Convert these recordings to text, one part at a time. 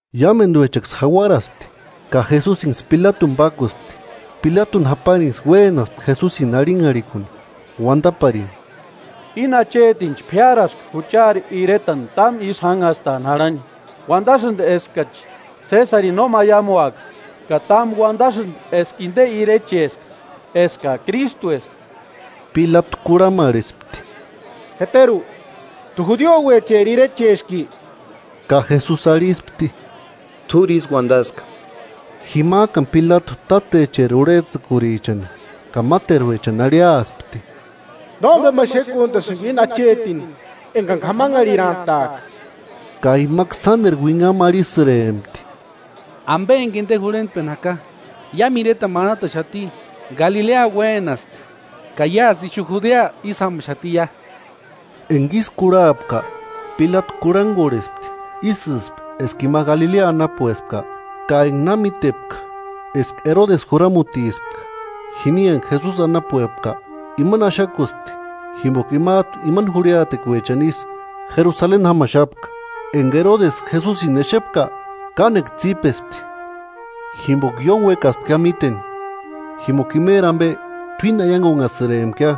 Iámenduechaksï jauaraspti, ka Jesusinksï Pilatuni pákuspti. Pilatuni japarinksï uénaspti Jesusini arhinharhikuni, uandaparini: –Íni achetinchi p'iáraska juchari iretani támu ísï jánhastani jarhani. Uandasïndi eskachi Sésarini no maiamuaka, ka támu uandasïndi eska inde irecheska, eska Krístueska. Pilatu kurhamarhesti: –¿Jeteru, t'u judiouecheri Irecheski? Ka Jesusi arhispti: –T'úri ísï uandaska. Jimajkani Pilatu tátecheri urhejtsïkurichani ka máteruechani arhiaspti: –Nómbema xékuntasïnga íni achetini engani k'amanharhitarantaaka. Ka imaksï sánderu uinhamu arhisïrempti: –Ambe enga inde jurhentpeni jaka, iámu iretani manataxati. Galilea uénasti, ka iásï ixu Judea ísï jámaxatiia. Enga ísï kurhapka, Pilatu kurhangorhespti ísïspki eska ima Galilea anapuespka. Ka enga na mítepka eska Erodesi juramutispka jini enga Jesusi anapuepka, imani axakuspti jimboka imajtu imani jurhiatekuechani isï Jerusaleni jámaxapka. Enga Erodesi Jesusini exepka, kánekua tsípespti, jimboka ióni uekaspkia míteni, jimboka imeri ambe t'uíni aiangunhasïrempkia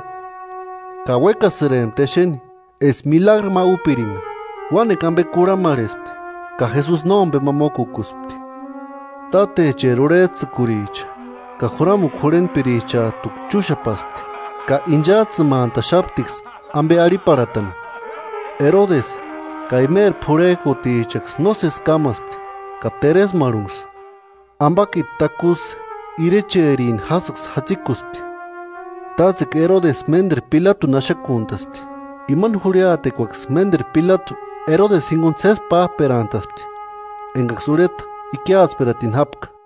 ka uéksïrempti exeni eska milagru ma úpiringa. Uánekua ambe kurhamarhespti, ka Jesusi nómbema mókukuspti. Tátecheri urhejtsïkuricha ka juramukua jurhentpirichajtuksï chúxapaspti ka inchajtsïmantaxaptiksï ambe arhiparhatani. Erodesi ka imeri p'urhejkutichaksï nósesi kámaspti ka teresmarhunksï, ambakiti takusï irecherini jásïksï jatsikuspti. Tátsekua Erodesi ménderu Pilatuni axakuntaspti. Ima jurhiatekuaksï ménderu Pilatu Erodesi jinguni sési p'ájperantaspti, engaksï urheta ikiatsperatini jápka.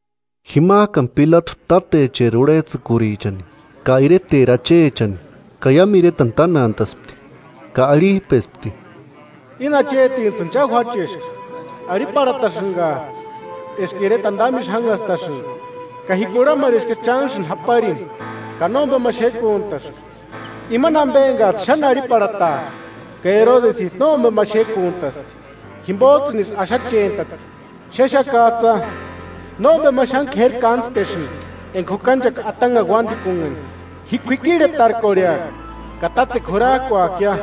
Jimajkani Pilatu tátecheri urhejtsïkurichani ka ireteri achechani ka iámu iretani tánantaspti, ka arhijpespti: –Íni achetintsïni cha juácheska, arhiparhatasïngajtsï eska iretani támu ísï jánhastasïnga; ka ji kurhamarheskia chánksïni japarini, ka nómbema xékuntaska imani ambe engajtsï xáni arhiparhatajka. Ka Erodesijtu nómbema xékuntasti, jimbojtsïnisï axachentati. Xéxakajtsïa, nómbema xáni k'éri kántspesïndi enga jukanchaka atanhani uándikunhani. Ji k'uikirhetarkorheaka ka tátsekua jurajkuakia.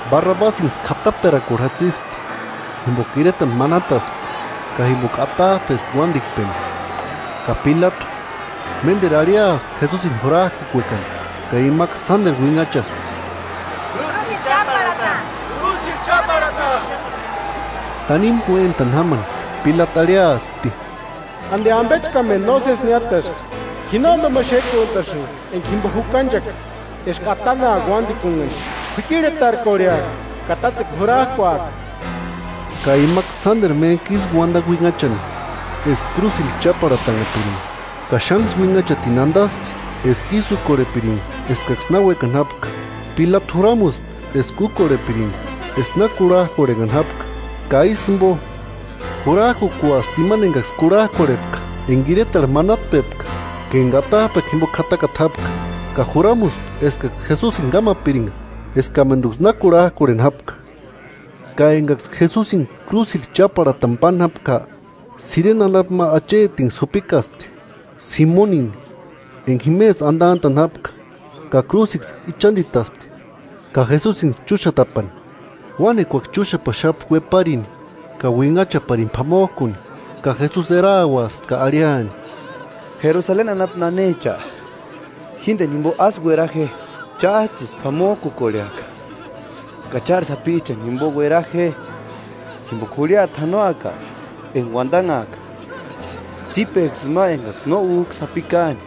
Barrabasïnksï k'ataperakuarhu jatsispti jimboka iretani manataspka, ka jimboka atajpespka uándikpeni, ka Pilatu, ménderu arhiaspti Jesusini jurajkukuekani; ka imaksï sánderu uinhachaspti: –¡Krúsirhu cháparhata! ¡Krúsirhu cháparhata! Tanimu uéntani jámani Pilatu arhiaspti: –¿Andi ambechkamendu nósesi niátaski? Ji nómbema xékuntasïnga enga jimbo jukanchaka eska atanhaaka uándikunhani. K'uikirhetarkorheaka ka tátsekua jurajkuaaka. Ka imaksï sánderu méntku ísï uandani uinhachani, eska krúsirhu cháparhatanhapiringa; ka xánksï uinhachatini andaspti eska ísï úkorhepiringa eskaksï na uékani jápka. Pilatu juramuspti eska úkorhepiringa eska na kurhajkorhenhani jápka; ka ísï jimbo, jurajkukuaspti imani engaksï kurhajkorhepka enga iretarhu manatajpepka ka enga atajpekua jimbo k'atakata jápka, ka juramuspti eskaksï Jesusini kámapiringa eskamenduksï na kurhajkorheni jápka. Ka engaksï Jesusini krúsirhu cháparhatani páni jápka, Sirene anapu ma achetinksï jupikaspti, Simonini, enga jimesï andantani jápka, ka krúsiksï ichanditaspti ka Jesusinksï chúxatapani. Uánekuaksï chúxapaxapti ueparini ka uinhachaparini p'amojkuni, ka Jesusi erauaspti ka arhiani: –Jerusaleni anapu nanecha, jíndeni jimbo ásï uera je, chájtsïsï p'amojkukorheaka ka chári sapichani jimbo uera je. Jimboka jurhiata janoaka enga uandanhaaka: Tsípeksï ima engaksï no újka sapi káani,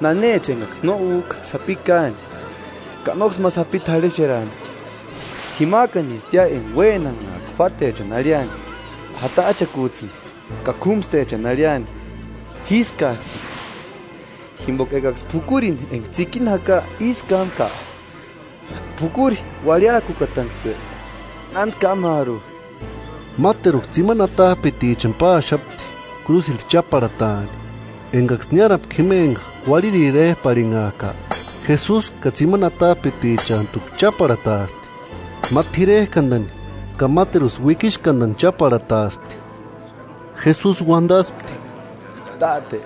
nanecha engaksï no úka sapi káani ka nóksï ma sapini t'arhexerani. Jimajkanistia enga uénanhaaka juátechani arhiani: ¡Jatajchakujtsïni! Ka k'úmstechani arhiani: ¡Jískajtsïni! Jimboka ekaksï p'ukurini enga tsikini jaka ísï kámka, ¿P'ukuri uarhiakukatanksï nándi kámaaru? Máteruksï tsimani atajpitichani páaxapti krúsirhu cháparhataani. Engaksï niárapka jima enga Uarhiri éjpu arhinhajka, Jesusini ka tsimani atajpitichantuksï cháparhataaspti, ma t'irerkandani ka máteru uikixkandanksï cháparhataaspti, [Jesusi uandaspti: “Táte,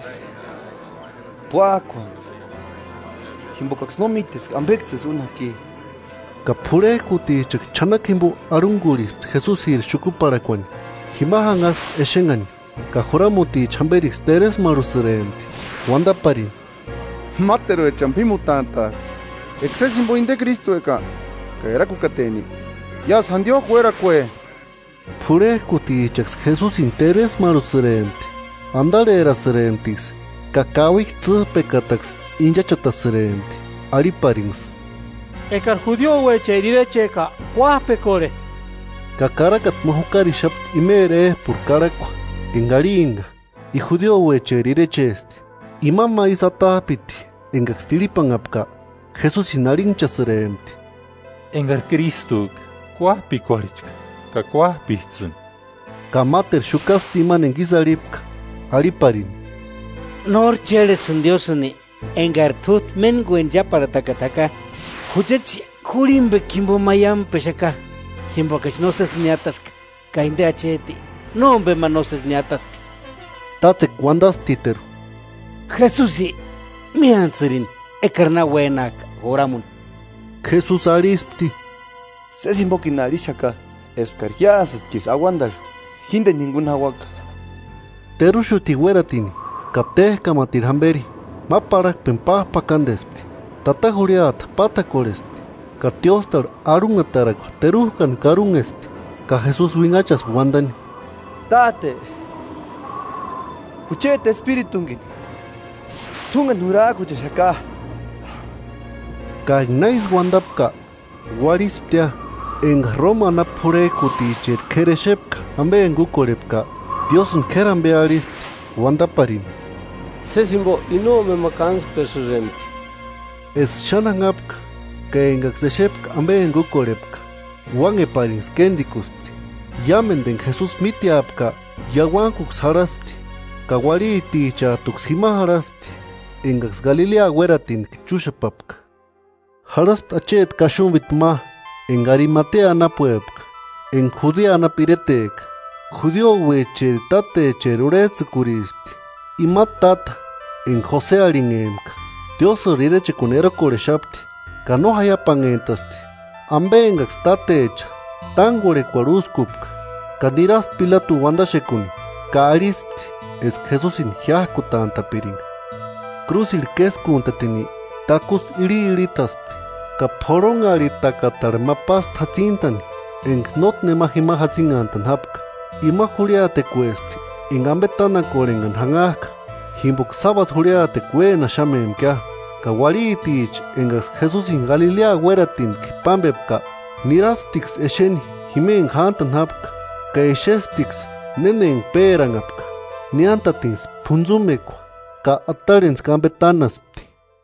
púakuantsï, jimbokaksï no míteska ambeksïsï úni jaki.”] Ka p'urhejkutichaksï ch'anakua jimbo arhungurhispti Jesusiri xukuparhakuani. Jima janhaspti exenhani; ka juramuticha jamberiksï teresmarhusïrempti, uandaparini: –Máteruechani p'ímutantaasti; eka sési jimbo inde Krístueka ka erakukateni iásï jandiojku uérakue. P'urhejkutichajtuksï Jesusini teresmarhusïrempti. Andarherasïremptiksï ka kauikua tsîjpekataksï inchachatasïrempti, arhiparinksï: –¡Ekari judiouecheri irecheka, kuájpekorhe! Ka karakata ma jukarixapti imeri éjpurhu karhakua enga arhimpka: “I judiouecheri irechesti.” Ima ma isï atajpiti engaksï tirhipanhapka, Jesusini arhinhchasïrempti: –¡Ekari Krístueka, kuájpekorhechka ka kuájpejtsïni! Ka máteru xukaspti imani enga ísï arhipka, arhiparini: –¿Nóri chérhesïnki Diósïni, engari t'újtu méntkueni cháparhatakata jaka? Juchachi jurhimbekuarhu maiampexaka, jimbokachi nósesi niátaska; ka inde acheti nómbema nósesi niátasti. Tátsekua uandasptiteru: –Jesusi, miántsïrini ekari na uénajka juramuni. Jesusi arhispti: –Sési jimbokini arhixaka eskari iásïtkisï auandarhu jíndeni jinguni jauaka. Teruxutini uératini ka téjkamatiru jamberi ma parhakpeni pájpakandespti. Tata jurhiata pátakorhespti ka tióstarhu arhunhatarakua terujkani karunhespti. Ka Jesusi uinhachaspti uandani: –¡Táte, jucheti espiritungini t'úngeni jurajkuchexaka! Ka enga na ísï uandapka, uarhisptia. Enga Roma anapu p'urhejkuticheri k'éri exepka ambe enga úkorhepka, Diósïni k'éri ambe arhispti uandaparini: –Sési jimbo i nómbema kántspesïrempti. Eska xáni janhapka, ka engaksï exepka ambe enga úkorhepka, uánheparinksï kéndikuspti. Iámendu enga Jesusi míteapka iauankuksï jarhaspti; ka uarhitichajtuksï jima jarhaspti engaksï Galilea uératinitki chúxapapka. Jarhaspti acheti kaxumbiti ma enga Arimatea anapuepka, enga Judea anapu ireteka. Judiouecheri tátecheri urhejtsïkurispti. Ima táta enga Jose arhinhempka, Diósïri irechekuani erokorhexapti ka no jaiapanhentaspti ambe engaksï tátecha tángorhekuarhu úskupka, ka niraspti Pilatuni uandaxekuni ka arhispti eska Jesusini jiájkutantapiringa. Krúsirhu késkuntatini, takusï irhiirhitaspti ka p'orhonharhitakatarhu ma páspti jatsintani enga nótki nema jima jatsinhantani jápka. Ima jurhiatekuespti enga ambe tánakorhenhani janhajka, jimboka sábadu jurhiatekua uénaxamempkia. Ka uarhiticha engaksï Jesusini Galilea uératinitki pámbepka, nirasptiksï exeni jima enga jántani jápka, ka exesptiksï néna enga péranhapka. Niántatinksï p'untsumekua ka atarhentskua ambe tánaspti.